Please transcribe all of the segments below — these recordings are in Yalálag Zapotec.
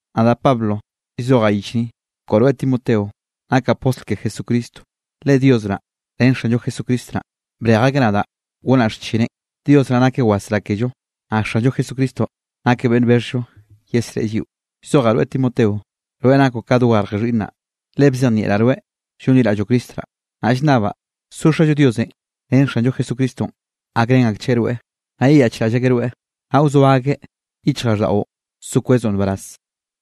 Nadaꞌ Pablo llzojaꞌ yich ni, koꞌo rweꞌ Timoteo nakaꞌ postl ke Jesucristo, le Dios naꞌ ren Xanllo Jesucristo naꞌ, brej akeꞌ nadaꞌ gonaꞌ xchineꞌ. Dios naꞌ nakeꞌ wasrá kello, naꞌ Xanllo Jesucristonꞌ nakeꞌ beꞌnn bexhllo yesreꞌe lliꞌo. Llzojaꞌ rweꞌ Timoteo, rweꞌ nakoꞌ ka dogarje xhiꞌnnaꞌ, le bzejnieꞌraꞌ rweꞌ llonliraꞌlloꞌ Cristo naꞌ. Naꞌ llnnabaꞌ so Xallo Diosenꞌ ren Xanllo Jesucristonꞌ, gakrén akchgueꞌ rweꞌ, naꞌ yeyaꞌchraꞌll akeꞌ rweꞌ, naꞌ wzoa akeꞌ yichjraꞌlldaꞌo so kwezoꞌ nbaraz.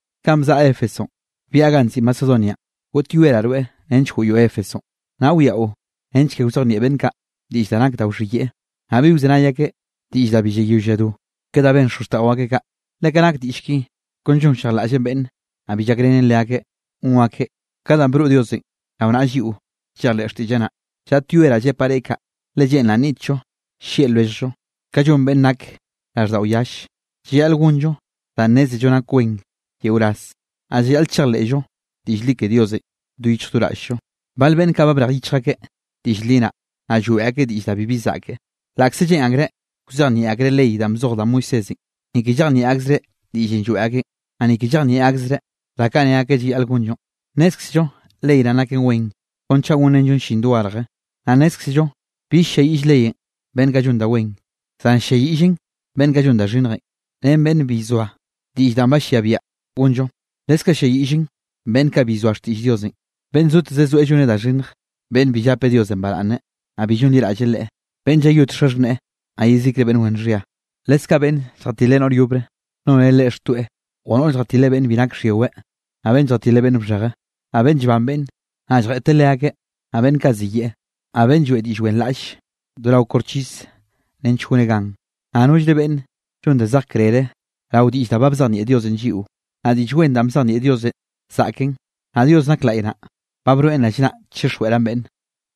Kanꞌ bzaꞌa Éfesonꞌ, byaꞌa ganꞌ nziꞌi Macedonianꞌ, goꞌtyoeraꞌ rweꞌ nench goꞌyoꞌ Éfesonꞌ, naꞌ wiaꞌo nench ke wzejnieꞌ beꞌnn kaꞌ diꞌll da nak da wxhiyeꞌe. Naꞌ bi wzenay akeꞌ diꞌll da bi llayoll lladó, ke da ben xozxtaꞌo akeꞌ kaꞌ. Le ka nak diꞌll ki kon llonllejlaꞌllen beꞌnne, naꞌ bi llakrenen leakeꞌ gon akeꞌ ka danꞌ broꞌ Diosenꞌ rao naꞌa lliꞌo llejleꞌ xtiꞌlleꞌ naꞌ. Llaꞌtyoeraꞌ llepaꞌ reꞌ kaꞌ, le lleꞌnraꞌ nniꞌtllo llieꞌ lwelljllo ka llon beꞌnn nak raꞌlldaꞌo yalle, llayaꞌl gonllo danꞌ nnézello nak wen yeo ras, naꞌ llayaꞌl chejleꞌllo diꞌll li ke Diosenꞌ do yichj do raꞌll-llo. Bal beꞌnn kaꞌ ba brej yichj akeꞌ diꞌll li naꞌ, naꞌ lloeꞌ akeꞌ diꞌll da bibi zaꞌke. Laꞌkze lleꞌn akreꞌ wzejnieꞌ akreꞌ ley danꞌ bzoj da Moisésenꞌ, ni ke llejnieꞌ akzereꞌ diꞌllenꞌ lloeꞌ akeꞌn, naꞌ ni ke llejnieꞌ akzereꞌ da kaꞌ ne akeꞌ llayaꞌl gonllonꞌ. Nnézkzello ley naꞌn nak wen kon chaꞌ gonrenllon llin dogarje. Naꞌ nnézkzello bi ll-lliayiꞌll leyenꞌ beꞌnn kaꞌ llon da wen, zan ll-lliayiꞌllen beꞌnn kaꞌ llon da xhinnjenꞌ, ren beꞌnn bi llzoa diꞌll danꞌ ba llia biaꞌa gonllo. Leskaꞌ ll-lliayiꞌllen beꞌnn kaꞌ bi llzoa xtiꞌll Diosenꞌ, beꞌnn zoteze zoeꞌ lloneꞌ da xhinnj, beꞌnn bi llape Diosenꞌ baraꞌnne, naꞌ bi llonliraꞌlle Leꞌe, beꞌnn llayot xaxhneꞌe, naꞌ yezikre beꞌnn wen xhia. Leskaꞌ beꞌnn lljatile noꞌr yobre noneꞌ leꞌe xtoeꞌ o noꞌr lljatile beꞌnn bi nak xhyiweꞌ, naꞌ beꞌnn lljatile beꞌnn bxheje, naꞌ beꞌnn llban beꞌnn, naꞌ lljeꞌteꞌ leakeꞌ, naꞌ beꞌnn kaꞌ ziyeꞌe, naꞌ beꞌnn lloeꞌ diꞌll wenraꞌlle do rao koxchis nench goneꞌ gan, naꞌ nollre beꞌnn llon da zej krere rao diꞌll da ba bzejnieꞌ Diosenꞌ lliꞌo. Naꞌ Diꞌll Wen danꞌ bzejnieꞌ Diosenꞌ zaꞌken, naꞌ Dios nak laꞌy naꞌ, ba broeꞌn rallnaꞌ chixjweꞌraꞌn beꞌnne.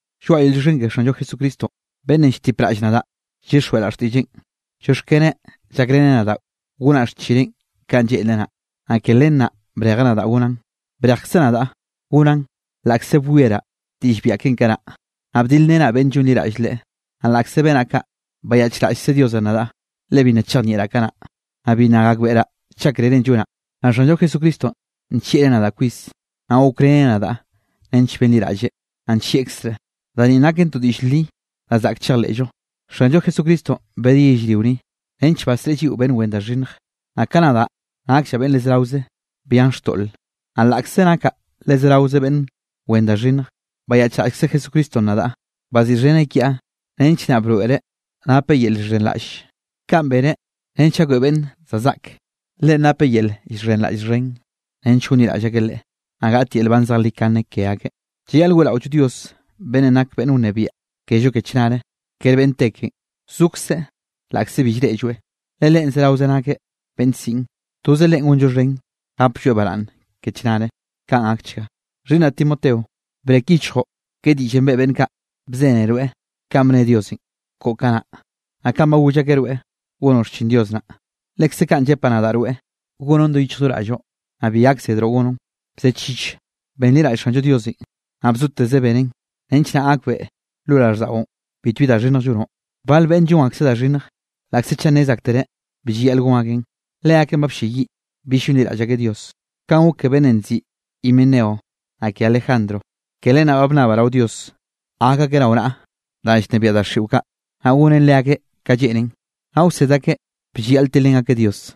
Lloaꞌa yel llioxken ke Xanllo Jesucristo beꞌnnenꞌ lltipraꞌll nadaꞌ llyixjweꞌraꞌ xtiꞌlleꞌn. Llioxkeneꞌn llakreꞌ nadaꞌ gonaꞌ xchineꞌ kanꞌ lleꞌnreꞌ naꞌ, naꞌ ke len naꞌ brejeꞌ nadaꞌ gonaꞌn. Brejkzeꞌ nadaꞌ gonaꞌn laꞌkze bwieraꞌ diꞌll biaꞌa keꞌen kanaꞌ, naꞌ bdilrenaꞌ beꞌnn llonliraꞌll Leꞌe, naꞌ laꞌkze benaꞌ kaꞌ, bayaꞌchraꞌllkze Diosenꞌ nadaꞌ, le bi nna chejnieꞌraꞌ kanaꞌ, naꞌ bi nna gakbeꞌraꞌ chaꞌ krerenꞌ llonaꞌ. Naꞌ Xanllo Jesucristonꞌ nllieꞌreꞌ nadaꞌ kwis, naꞌ gokreneꞌ nadaꞌ nench benliraꞌlleꞌ, naꞌ nllieꞌkzreꞌ. Da ninꞌ naken to diꞌll li da zaꞌk chejleꞌllo: Xanllo Jesucristonꞌ bedeꞌ yellrio ni, nench basreꞌe lliꞌo beꞌnn wen da xhinnj, naꞌ kaꞌ nadaꞌ nakllaꞌ beꞌnn le zeraoze byan xtoꞌle. Naꞌ laꞌkze nakaꞌ le zeraoze beꞌnn wen da xhinnj, bayaꞌchraꞌllkze Jesucristonꞌ nadaꞌ, baziꞌxheneꞌ kiaꞌ nench naꞌ broeꞌreꞌ napeꞌ yel llxhenraꞌlle. Kaꞌn beneꞌ nench gakbeꞌe beꞌnn za zaꞌk, Leꞌen napeꞌ yel llxhenraꞌll xhen nench gonliraꞌll akeꞌ Leꞌe, naꞌ gaꞌt yel nban zejlikane ke akeꞌ. Llayaꞌl weꞌraollo Dios beꞌnnenꞌ nakeꞌ beꞌnn wnebiaꞌ kello ke chnare. Kere beꞌnn te keꞌen, zokzeꞌ laꞌkze bi llreꞌlloeꞌ, le Leꞌen zeraoze nakeꞌ beꞌnn siꞌn. Toze Leꞌen gonllo xhen, gaplloeꞌ baraꞌnne ke chnare. Kaꞌn gakchga. Xhiꞌnnaꞌ Timoteo, brek yichjoꞌ ke diꞌllenꞌ beꞌe beꞌnn kaꞌ bzene rweꞌ kanꞌ bne Diosenꞌ koꞌo kanaꞌ. Naꞌ kanꞌ ba goll akeꞌ rweꞌ gonoꞌ xchin Dios naꞌ, lekze kaꞌn llepaꞌ nadaꞌ rweꞌ gonoꞌn do yichj do raꞌlloꞌ, naꞌ bi gakzedroꞌ gonoꞌn. Bzechich, benliraꞌll Xanllo Diosenꞌ, naꞌ bzoteze benen, nench naꞌ gakbeꞌe lo raꞌlldaꞌon bitbi da xhinnj llonoꞌ. Bal beꞌnne llon akseꞌ da xhinnj, laꞌkze chaꞌ nnez aktereꞌ bi llayaꞌl gon akeꞌn, leakeꞌn ba blleyiꞌ bill llonliraꞌll akeꞌ Dios. Kaꞌn gok ke beꞌnnenꞌ nziꞌi Himeneo naꞌ ke Alejandro. Ke len naꞌ ba bnnabaꞌ rao Dios gak akeꞌ rao naꞌa danꞌ llnebiaꞌ daxiꞌo kaꞌ, naꞌ gonen leakeꞌ ka lleꞌnen, naꞌ wsed akeꞌ bi llayaꞌl tilrén akeꞌ Dios.